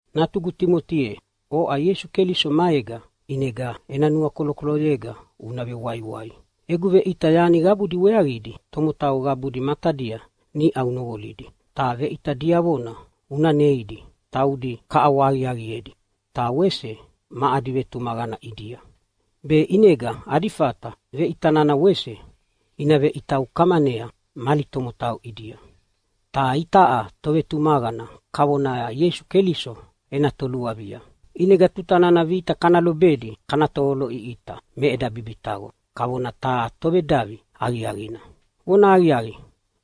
Natugu Timoti ye, oʼa Ieisu Keliso maega, ʼinega ena nuakolokoloyega una vewaiwai. Egu veʼita yani qabudi weaqidi tomotau qabudi matadia niʼa unoqolidi. Ta veʼita diavona una neidi taudi kaʼawahaqiaqiedi ta wese ma adi vetumaqana ʼidia, be ʼinega adi fata veʼita nana wese ina veʼita ukamanea mali tomotau ʼidia. Ta itaʼa tovetumaqana kavona Ieisu Keliso ena toluavia. ʼInega tuta nana vita kana lobedi kana tovoloʼiʼita me eda bibitaqo kavona taha tovedavi aqiaqina. Vonahaqiaqi,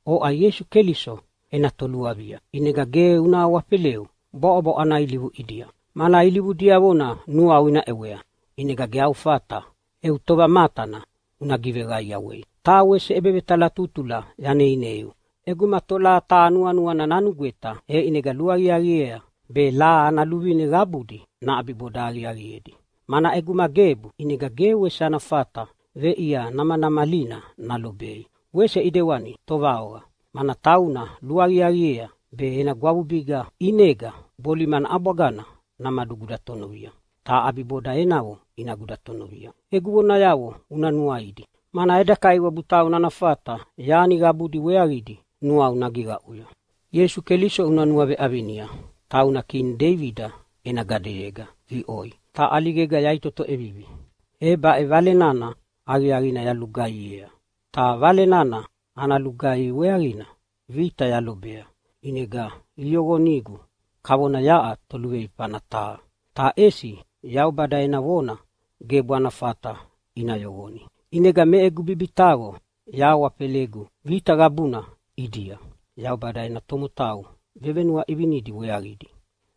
oʼa Ieisu Keliso ena toluavia, ʼinega ge una awafeleu bwaʼobwaʼo ana ilivu ʼidia, mana ilivu diavona nuau ina ʼewea, ʼinega ge au fata eu tovamatana una giveqaiawei. Taha wese ʼebevetalatutula yaneineiu: ʼEguma tolaha taha nuanuana nanugweta, e ʼinega luaqiaqiea be laha ana luvine qabudi naʼabiboda aqiaqiedi. Mana ʼeguma gebu ʼinega ge wese ana fata veʼia namanamalina nalobei. Wese ʼidewani tovaoqa, mana tauna luaqiaqiea be ena gwavubiga ʼinega bolimana ʼabwagana namadugudatonovia, ta ʼabiboda enavo ina gudatonovia. Egu vonayavo una nuaidi, mana eda Kaiwabu tauna ana fata yani qabudi weaqidi nuau nagiqaʼuya. Ieisu Keliso una nuaveʼavinia, tauna kini Deibida ena gadeyega viʼoi, ta ʼaligega yaʼitoto ʼevivi. E baʼe Vale nana Aqiaqina yalulugaihiea. Ta Vale nana ana lugaihi weaqina vita yalobea ʼinega iyoqonigu kavona yaʼa toluveifana taha. Ta ʼesi Yaubada ena vona gebu ana fata ina yoqoni. ʼInega me egu bibitaqo yahawafelegu vita qabuna ʼidia Yaubada ena tomotau vevenuaʼivinidi weaqidi,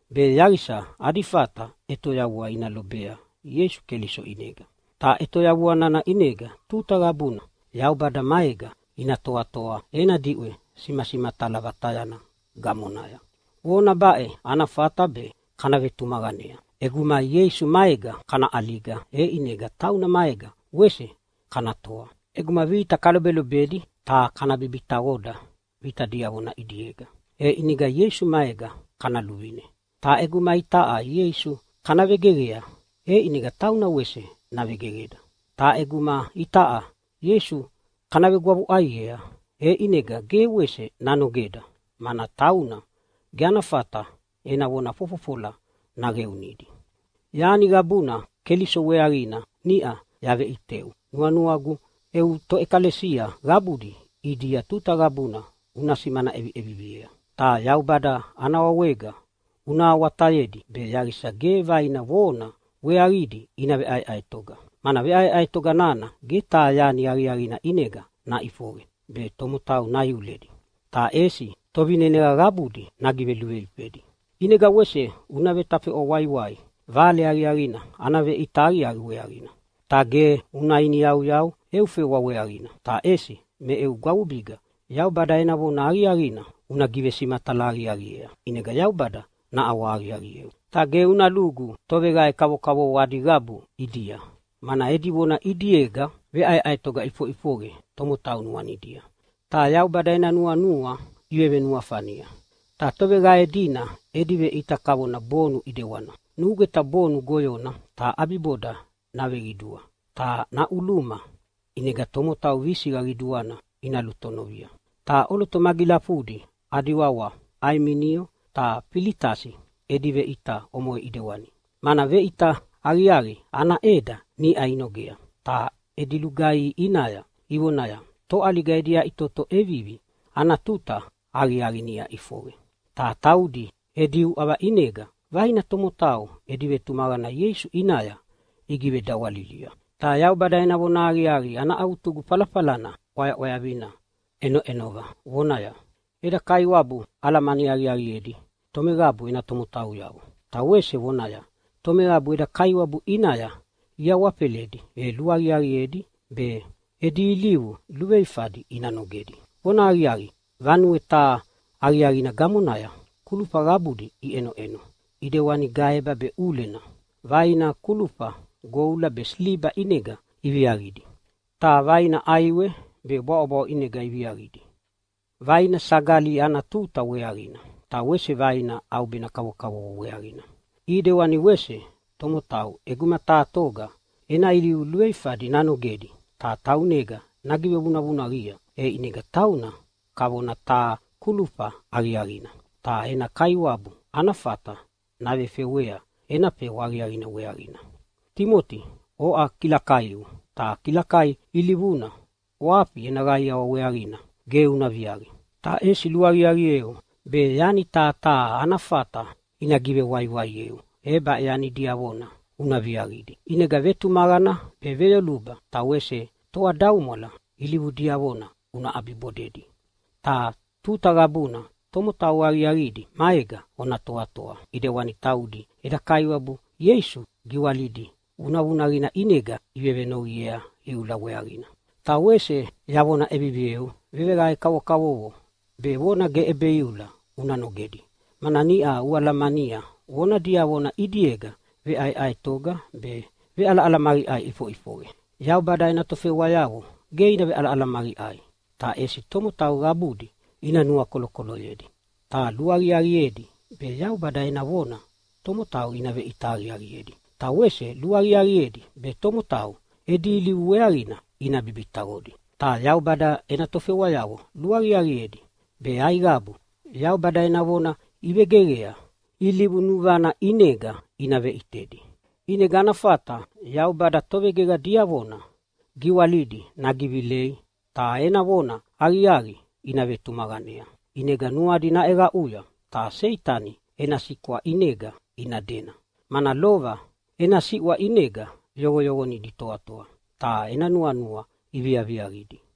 be yaqisa adi fata ʼetoyavua ina lobea Ieisu Keliso ʼinega. Ta ʼetoyavua nana ʼinega tuta qabuna Yaubada maega ina toatoa ena diʼwe simasimatala vatayana gamonaya. Vona baʼe ana fata be kana vetumaqanea: ʼEguma Ieisu maega kana ʼaliga, e ʼinega tauna maega wese kana toa. ʼEguma vita kalobelobedi ta kana bibitaqoda vita diavona ʼidiega, e ʼinega Ieisu maega kana luvine. Ta ʼeguma itaʼa Ieisu kana vegeqea, e ʼinega tauna wese navegeqeda. Ta ʼeguma itaʼa Ieisu kana vegwavuʼaiea, e ʼinega ge wese nanogeda, mana tauna ge ana fata ena vona fofofola naqeunidi. Yani qabuna Keliso weaqina niʼa yaveʼiteu nuanuagu eu toʼekalesia qabudi ʼidia tuta qabuna una simana ʼeviʼeviviea. Ta Yaubada ana wawega una awatayedi be yaqisa ge vaina vona weaqidi ina veʼaeʼaetoga, mana veʼaeʼaetoga nana ge taha yani aqiaqina ʼinega naʼifoqe be tomotau naiuledi, ta ʼesi tovineneqa qabudi nagiveluveifedi. ʼInega wese una vetafeʼwa waiwai Vale Aqiaqina ana veʼita aqiaqi weaqina. Ta ge una iniyauyau eu fewa weaqina, ta ʼesi me eu gwavubiga Yaubada ena vona aqiaqina una givesimatala aqiaqiea, ʼinega Yaubada naʼawahaqiaqieu. Ta ge una lugu toveqae kavokavovo adi qabu ʼidia, mana edi vona ʼidiega veʼaeʼaetoga ʼifoʼifoqe tomotau nuanidia ta Yaubada ena nuanua ivevenuafania. Ta toveqae dina edi veʼita kavona bonu ʼidewana. Nugweta bonu goyona ta ʼabiboda naveqidua ta naʼuluma, ʼinega tomotau visiqa qiduana ina lutonovia. Ta ʼoloto magilafudi adi wawa Aiminio ta Filitasi edi veʼita omoʼe ʼidewani. Mana veʼita aqiaqina ana ʼeda niʼa inogea ta edi lugaihi ʼinaya ivonaya, “Toʼaliga edi yaʼitoto ʼevivi ana tuta aqiaqi niʼa ʼifoqe.” Ta taudi edi uʼava ʼinega vaina tomotau edi vetumaqana Ieisu ʼinaya igivedawalilia. Ta Yaubada ena vonahaqiaqi ana avutugu falafalana ʼwayaʼwayavina ʼenoʼenova vonaya, “Eda Kaiwabu alamani aqiaqiedi tomeqabu ena tomotauyavo.” Ta wese vonaya, “Tomeqabu eda Kaiwabu ʼinaya iawafeledi e luaqiaqiedi be edi ilivu luveifadi ina nogedi.” Vonahaqiaqi, vanue taha aqiaqina gamonaya kulufa qabudi iʼenoʼeno ʼidewani gaeba be ʼulena. Vaina kulufa goula be siliba ʼinega iviaqidi, ta vaina ʼaiwe be bwaʼobwaʼo ʼinega iviaqidi. Vaina sagali ana tuta weaqina, ta wese vaina ʼaubena kavokavovo weaqina. ʼIdewani wese tomotau, ʼeguma taha toga ena ilivu luveifadi nanogedi ta taunega nagivevunavunaqia, e ʼinega tauna kavona taha kulufa aqiaqina ta ena kaiwabu ana fata navefewea ena fewa aqiaqina weaqina. Timoti, oʼa kilakaiu, ta kilakai ilivuna ʼwafi ena qaiawa weaqina ge una viaqi. Ta ʼesi luaqiaqieu be yani taha taha ana fata ina givewaiwaieu e baʼe yani diavona una viaqidi. ʼInega vetumaqana be veyoluba ta wese toadaumwala ilivu diavona una ʼabibodedi. Ta tuta qabuna tomotau aqiaqidi maega ona toatoa, ʼidewani taudi eda Kaiwabu Ieisu giwalidi vunavunaqina ʼinega ivevenoqiea iula weaqina. Ta wese yavona ʼevivieu, veqae kavokavovo be vona ge ʼebeiula una nogedi, mana niʼa ualamania vona diavona ʼidiega veʼaeʼaetoga be veʼalaʼalamaqiʼai iʼifoʼifoqe. Yaubada ena tofewayavo ge ina veʼalaʼalamaqiʼai, ta ʼesi tomotau qabudi ina nuakolokoloyedi. Ta luaqiaqiedi be Yaubada ena vona tomotau ina veʼita aqiaqiedi, ta wese luaqiaqiedi be tomotau edi ilivu weaqina ina bibitaqodi. Ta Yaubada ena tofewayavo luaqiaqiedi be aiqabu Yaubada ena vona ivegeqea ilivu nuvana ʼinega ina veʼitedi. ʼInega ana fata Yaubada tovegeqa diavona giwalidi nagivilei ta ena vona aqiaqina ina vetumaqanea. ʼInega nuadi naʼeqaʼuya ta Seitani ena siʼwa ʼinega ina dena. Mana lova ena siʼwa ʼinega yoqoyoqonidi itoatoa ta ena nuanua iviaviaqidi.